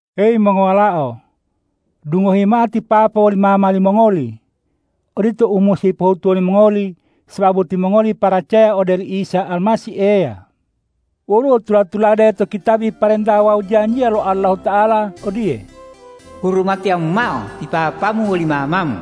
Weyi mongowalao! Dungohi mao ti papa woli mama limongoli. Odito u musi pohutuwo limongoli sababu timongoli paracaya ode oli Isa Almasih Eya. Woluwo tula-tulade to kitabi parenta wawu janjiya lo Allahuta'ala odiye,”Hurumatiyamu mao ti papamu woli mamamu,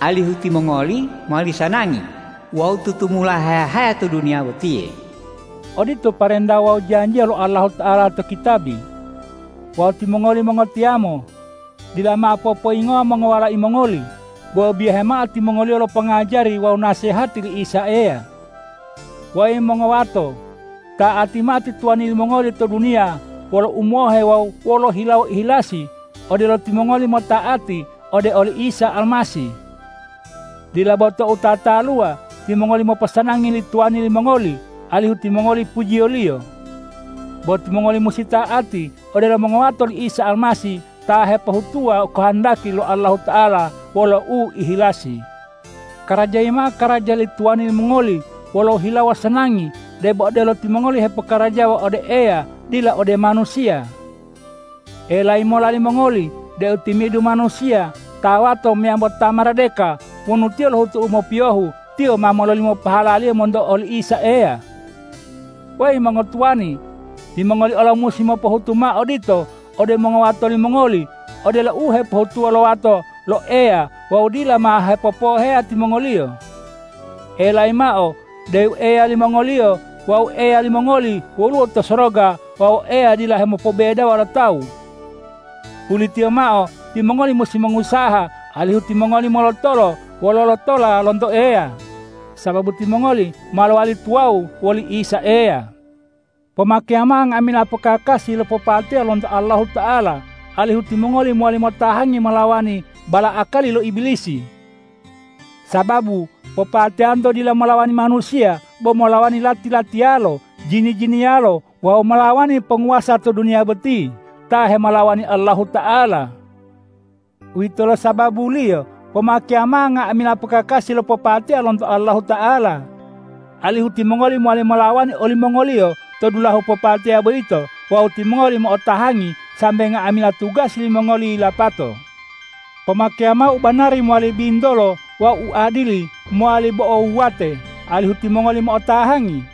alihu timongoli mowali sanangi wawu tutumula haya-haya to duniya botiye.” Odito parenta wawu janjiya lo Allahuta'ala to kitabi. Wawu timongoli mongotiyamo! Dila mao popoyingowa mongowalai mongoli, bo biyahe mao timongoliyo lo pongajari wawu nasehati li Isa Eya. Weyi mongowato! Ta'ati mao ti tuwani limongoli to duniya wolo umohe wawu wolo hilawo ihilasi odelo timongoli mota'ati ode oli Isa Almasih. Dila bo tou tataluwa, timongoli moposanangi li tuwani limongoli alihu timongoli pujiyoliyo. Bo timongoli musi ta'ati odelo mongowato li Isa Almasih ta hepohutuwa kohondaki lo Allahuta'ala wolo uihilasi. Karajayi mao karaja li tuwani limongoli wolo hilawo sanangi debo odelo timongoli hepokarajawa ode Eya dila ode manusiya. Elayi mola limongoli deu timi'idu manusiya, ta wato meyambo ta maradeka, wonu tiyo lohutu u mopiyohu, tiyo ma mololimo pahalaliyo monto oli Isa Eya. Weyi mongotuwani! Timongoli olo musi mopohutu mao odito ode mongowato limongoli odelo u hepohutuwo lo wato lo Eya wawu dila mao hepopowoheya timongoliyo. Elayi mao deu Eya limongoliyo wawu Eya limongoli woluwo to soroga wawu Eya dila hemopobebedawo lo tawu. Pulitiyo mao, timongoli musi mongusaha alihu timongoli molotolo wolo lotola lonto Eya, sababu timongoli ma lowali tuwawu woli Isa Eya. Pomakeya mao nga'amila pokakasi lo popateya lonto Allahuta'ala, alihu timongoli mowali motahangi molawani bala'akali lo Ibilisi. Sababu popateyanto dila molawani manusiya, bo molawani lati-latiyalo, jini-jiniyalo wawu molawani ponguwasa to duniya boti ta hemolawani Allahuta'ala. Uwitolo sababuliyo pomakeya mao nga'amila pokakasi lo popateya lonto Allahuta'ala, alihu timongoli mowali molawani olimongoliyo to dulahu popateya boyito wawu timongoli mo'otahangi sambe nga'amila tugasi limongoli yilapato. Pomakeya mao ubanari mowali bintolo wawu uadili mowali bo'o wuwate, alihu timongoli mo'otahangi.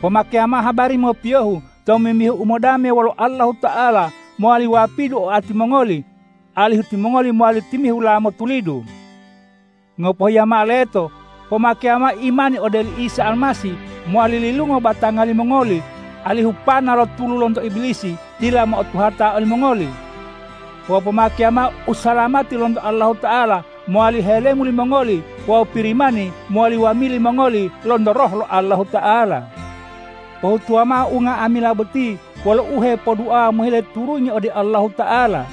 Pomakeya mao habari mopiyohu tomimbihu umodame wolo Allahuta'ala mowali wapidu oati mongoli, alihu timongoli mowali timihula motulidu. Ngopohiya mao leto, pomakeya mao imani ode oli Isa Almasih mowali lilungo batanga limongoli, alihu pana lo tulu lonto Ibilisi dila mo'otuhata olimongoli. Wawu pomakeya mao usalamati lonto Allahuta'ala mowali helemu limongoli wawu Pirimani mowali wamili mongoli lonto Roh lo Allahuta'ala. Pohutuwa mao unga'amila boti wolo uhepoduawa mohile turungi ode Allahuta'ala.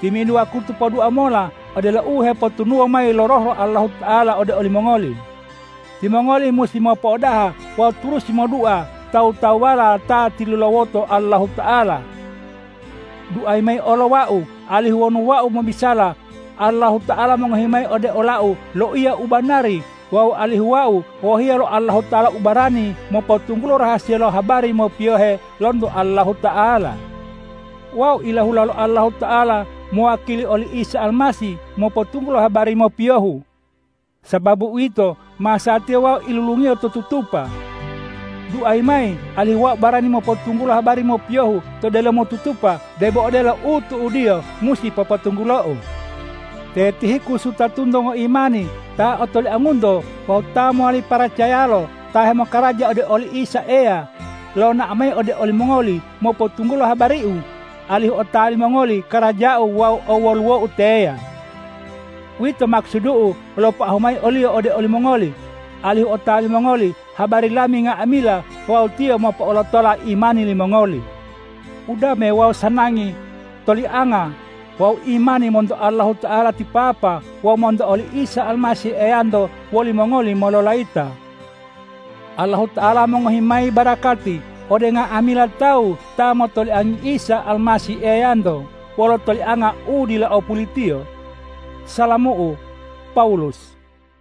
Timi'idu wakutu podua mola odelo u hepotunuwo mayi lo Roh lo Allahuta'ala ode olimongoli. Timongoli musi mopo'odaha wawu turusi modua tawu-tawuwala ta tilulawoto Allahuta'ala. Duayi mayi olo wau alihu wonu wau mobisala, Allahuta'ala mongohi mayi ode olau loiya u banari wawu alihu wau wohiya lo Allahuta'ala ubarani mopotunggulo rahasiya lo habari mopiyohe lonto Allahuta'ala. Wau ilahula lo Allahuta'ala mowakili oli Isa Almasih mopotunggulo habari mopiyohu. Sababu uwito, masatiya wau ilulungiyo to tutupa. Duayi mayi alihu wau barani mopotunggulo habari mopiyohu to delomo tutupa debo odelo u tu'udiyo musi popotunggulou. Te Tihikus wutatunto ngoimani ta otoliangunto wawu ta mowali paracayalo ta hemokaraja ode oli Isa Eya, lonao mayi ode olimongoli mopotunggulo habariu, alihu otawa limongoli karajau wawu owoluwou teya. Uwito makusudu'u lopoahu mayi oliyo ode olimongoli, alihu otawa limongoli habari lami nga'amila wawu tiyo mopo'olotola imani limongoli. Udame wawu sanangi, tolianga wawu imani monto Allahuta'ala ti Papa wawu monto oli Isa Almasih Eyanto wolimongoli mololayita. Allahuta'ala mongohi mayi barakati ode nga'amila tawu ta motoliangi Isa Almasih Eyanto wolo tolianga u dila o pulitiyo. Salamu'u, Pawulus